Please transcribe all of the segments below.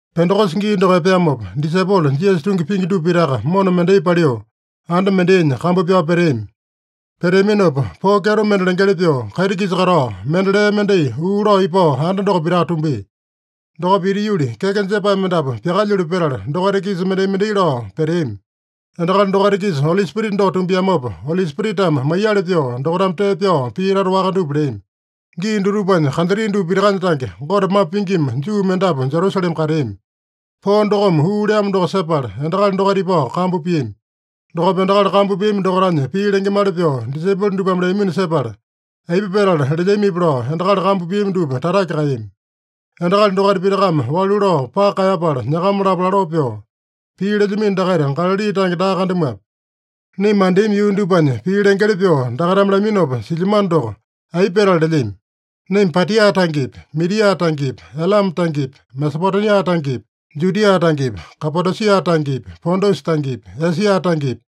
Pendekosa gii doko epeamopa, disaipolo Jisasa tungi pingi dupa pitaka mona mendai paliu anda mendainya kambu pyao peteami. Peteaminopa poo kyeto mende lengeli pyoo, kaiti-kisa katao mende lee mendai uu lao ipao anda doko pitaka tumbia. Dokopa ita yuli, keke jepae mendapu pyakaeyalu petala, dokaita-kisa mendai-mendai lao peteami. Endakali dokaita-kisa Oli Spirita doko tumbiamopa, Oli Spiritame maiyali pyoo dokaitame tee pyao pii tata waka dupa leami. Gii dutupanya kantri dupa pitakanya tange, Gote mambo pingima Juu mendapu Jerusalema kateami. Poo dokome uu leamo doko sepala, endakali dokaita ipao kambu piami. Dokopa endakali kambu piami dokaitanya pii lengemali pyoo disaipolo dupame leamino sepala, aipa petala lelyamipi lao endakali kambu piami dupa tatake kaeyami. Endakali dokaita pitakame walu lao paka kaeyapala nyakama-lapo laloo pyoo, “Pii lelyamino dakaita Galali tange daa kandamuape? Naima mandeami yuu dupanya pii lengeli pyoo dakaitame laminopa silyamano doko, aipa petala lelyami? Naima Patia tangepi, Midia tangepi, Elame tangepi, Mesopotemia tangepi, Judia tangepi, Kapadosia tangepi, Pontusa tangepi, Esia tangepi,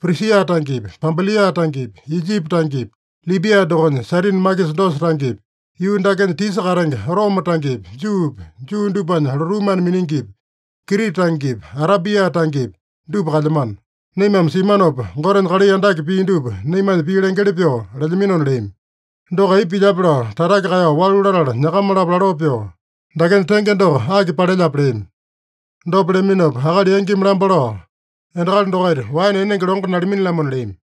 Prisia tangepi, Pampilia tangepi, Ijipi tangepi, Libia dokonya Sairini makisa dosa tangepi, yuu dakenya tisa katenge Roma tangepi, Juupi, Juu dupanya lotuu mana miningipi, Krita tangepi, Arabia tangepi, dupa kalyamano. Naimame simanopa, Gotenya kalai andake pia dupa naimanya pii lengeli pyoo lelyaminona” leami. Doko aipa pilyape lao tatake kaeyao walu latala, nyakama-lapo laloo pyoo, “Dakenya tenge doko aki palelyape?” leami. Dopa leaminopa akali yangimi lamba lao, “Endakali dokaita waene enenge longo nalamini-lamona” leami.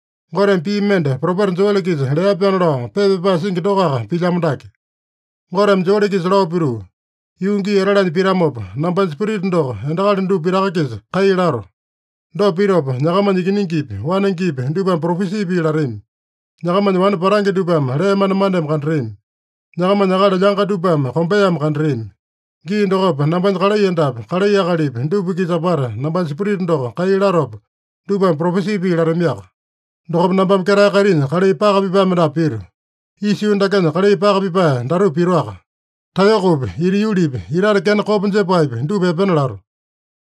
Goteme pii mende propeta Joele-kisa lea-pyaana lao pepa pyapae singi dokoaka pilyamo dake. Goteme Joele-kisa lao pituu, ‘Yuu gii etalanya pitamopa, nambanya Spirita doko endakali dupa pitaka-kisa kai lato. Dopa pitopa nyakamanya ikiningipi, wanengepi dupame propesi pii latami. Nyakamanya wane patange dupame lee manemaneme kandatami. Nyakamanya akali lyanga dupame kombeame kandatami. Gii dokopa nambanya kalai endapi, kalai akalipi dupa-kisa apata nambanya Spirita doko kai latopa, dupame propesi pii latamiaka. Dokopa nambame ketae kaitinya kalai paka pipae mendapu pito. Isa yuu dakenya kalai paka pipae datupa pitoaka: Taeyokopi, ita yulipi, itate kena kopa jepaepi, dupa epena lato.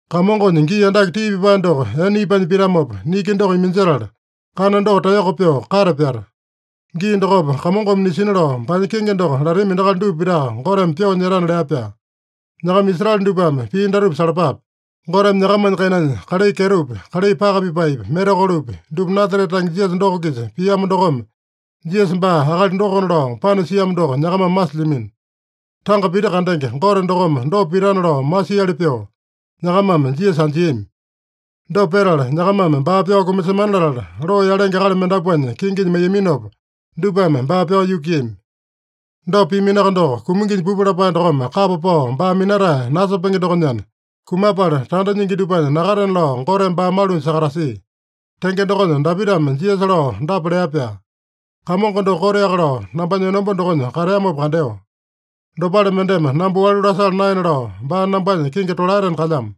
Kamongonya gii andake tii pipae doko ene ipanya pitamopa, niki doko iminjetala, kana doko taeyoko pyoo kate pyata. Gii dokopa Kamongome nisina lao baanya kenge doko latami endakali dupa pitaka Goteme pyoo nyetana’ lea-pyaa. “Nyakama Israele dupame pii datupa salapape: Goteme nyakamanya kainanya kalai kyetopi, kalai paka pipaepi, mirakolopi, dupa Nasarete tange Jisasa doko-kisa piamo dokome, Jisasa baa akali dokona lao panasiamo doko nyakamame masilyamino. Tanga pita kandenge Gote dokome dopa pitana lao masiali pyoo, nyakamame Jisasa anjiami. Dopa petala, nyakamame baa pyao kumasemana latala, loo yalenge akali mendapuanya kinginya maiyaminopa, dupame baa pyao yukuiyami. Dopa piaminoaka doko, kuminginya pupu lapae dokome kapa pao baa minatae nasepenge dokonyana, kumapala tanda nyingi dupanya nakatena lao Goteme baa malunya sakatasia. Tenge dokonya Dapitame Jisasa lao dapa lea-pyaa: ‘Kamongo doko koteaka lao nambanya enomba dokonya kateamopa kandeo. Dopale mendeme namba walu lasala naena lao, baa nambanya kingi tolaetena kalyamo.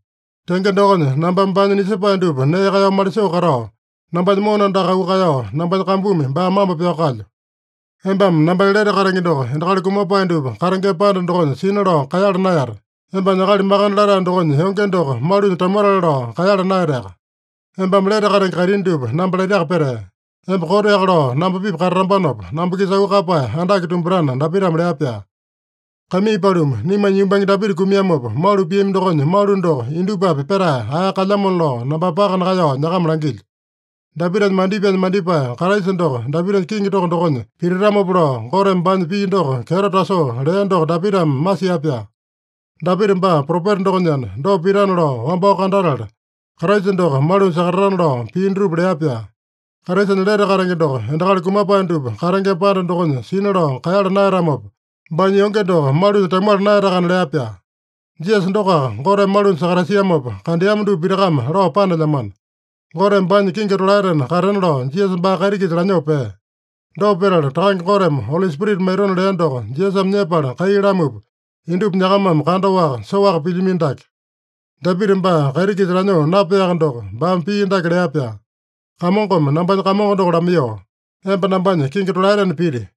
Tenge dokonya, nambame baanya nisepae dupa nee kaeyao malisoo katao, nambanya mona andaka auu kaeyao, nambanya kambumi baa mambo pyao kalyo. Embame nambanya lete katenge doko endakali kumapae dupa katengema panda dokonya sina lao kaeyala naeyate. Embanya Akali Makande Latae dokonya yonge doko malunya tamuatale lao kaeyala naeyateaka. Embame lete katenge kaitini dupa namba laitaka petee. Emba koteaka lao namba-pipa katatambanopa, namba-kisa auu kaeyapae andake tumbatana’ Dapitame lea-pyaa. “Kaimii paluma, naimanya yumbange Dapita kumiamopa, malu piami dokonya malu doko indupapi petae ae kalyamona lao nambame paka nakaeyao nyakama langilyo. Dapitanya mandipaenya mandipae Kraisa doko Dapitanya kiŋi toko dokonya pititamopa lao, Goteme baanya pii doko kyeto tasoo lea doko Dapitame masia-pyaa. Dapita baa propeta dokonyana, dopa pitana lao wambao kandatala, Kraisa doko malunya sakatatana lao pii dutupa lea-pyaa. Kraisanya lete katenge doko endakali kumapae dupa katengema panda dokonya sina lao kaeyala naeyatamopa, baanya yonge doko malunya tamuala naeyatakana lea-pyaa. Jisasa dokoaka Goteme malunya sakatasiamopa kandeama dupa pitakame lao panelyamano. Goteme baanya kingi tolaetena katena lao Jisasa baa kaiti-kisa lanyoo pea. Dopa petala Takange Goteme Oli Spirita maitona lea doko Jisasame nyepala kai lamupa, indupa nyakamame kandaowaka, soaka pilyamino dake. Dapita baa kaiti-kisa lanyoo napeaka doko, baame pii dake lea-pyaa: ‘Kamongome nambanya Kamongo doko lamaiyoo, “Emba nambanya kingi tolaetena piti.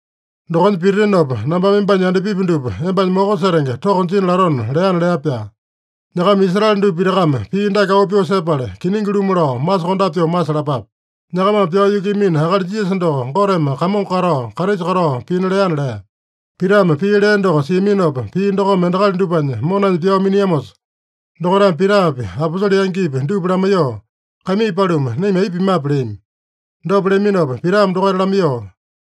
Dokonya pititinopa, nambame embanya yandapipi dupa embanya moko setenge toko jina latona” leana’ lea-pyaa. Nyakama Israele dupa pitakame pii dake auu pyoo sepala, kiningi-lumu lao masokondape pyoo masalapape: Nyakamame pyao yukuiyamino akali Jisasa doko, Goteme Kamongo katao, Kraisa katao pina leana” lea. Pitame pii lea doko siaminopa, pii dokome endakali dupanya monanya pyao miniamosa, dokaitame Pitapi, aposole yangipi dupa lamaiyoo, “Kaimii paluma, naima aipa pimape?” leami. Dopa leaminopa Pitame dokaita lamaiyoo,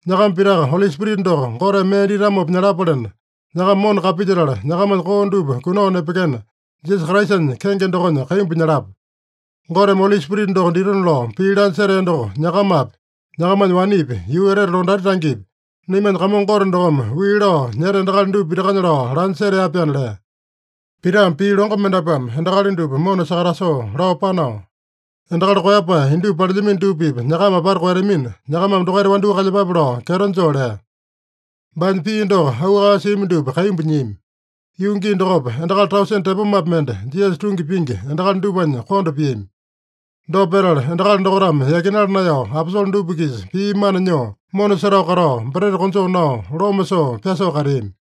“Nyakama pitaka Oli Spirita doko Goteme mee ditamopa nyalapalena, nyakama mona kapilyetala nyakamanya koo dupa kunao nepekena, Jisasa Kraisanya kenge dokonya kaimbu nyalapa. Goteme Oli Spirita doko ditona lao pii lanya setea doko nyakamapi, nyakamanya wanepi, yuu etete londati tangepi, naimanya Kamongo Gote dokome wii lao nyeta endakali dupa pitakanya lao lanya setea-pyaana” lea. Pitame pii longo mendapuame endakali dupa mona sakatasoo lao panao, “Endakali koeyapae indupa palelyamino dupa-pipa nyakama apata koeyatamina, nyakamame dokaita wandyoo kalyepape” lao kyeto joo lea. Baanya pii doko auu kaeyao siami dupa kaimbu nyiami. Yuu gii dokopa endakali tausene tepomapi mende Jisasa tungi pingi endakali dupanya konda piami. Dopa petala, endakali dokaitame yakinala naeyao aposole dupa-kisa pii mana nyoo, mona setao katao, breta konjoo nao, loma soo, pyasoo kateami.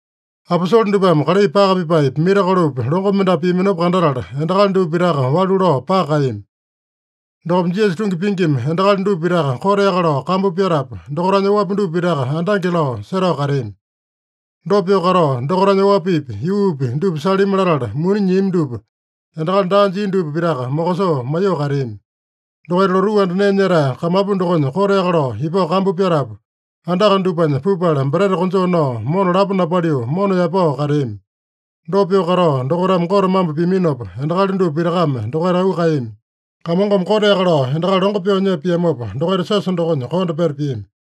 Aposole dupame kalai paka pipaepi, mirakolopi, longo mendapu piaminopa kandatala, endakali dupa pitaka walu lao paka kaeyami. Dokopa Jisasa tungi pingima endakali dupa pitaka koteaka lao kambu pyatapu, dokaitanya oapi dupa pitaka andange lao setao kateami. Dopa pyoo katao, dokaitanya oapipi, yuupi dupa salimi latala muni nyiami dupa endakali daa jia dupa pitaka mokosoo maiyoo kateami. Dokaita lotuu anda nee nyetae kamapu dokonya koteaka lao ipao kambu pyatapu, andaka dupanya pupala breta konjoo nao, mona lapo napaliu, mona yaepao kateami. Dopa pyoo katao dokaitame Gote mambo piaminopa, endakali dupa pitakame dokaita auu kaeyami. Kamongome koteaka lao endakali longo pyoo nyepa piamopa, dokaita siosa dokonya konda peta piami.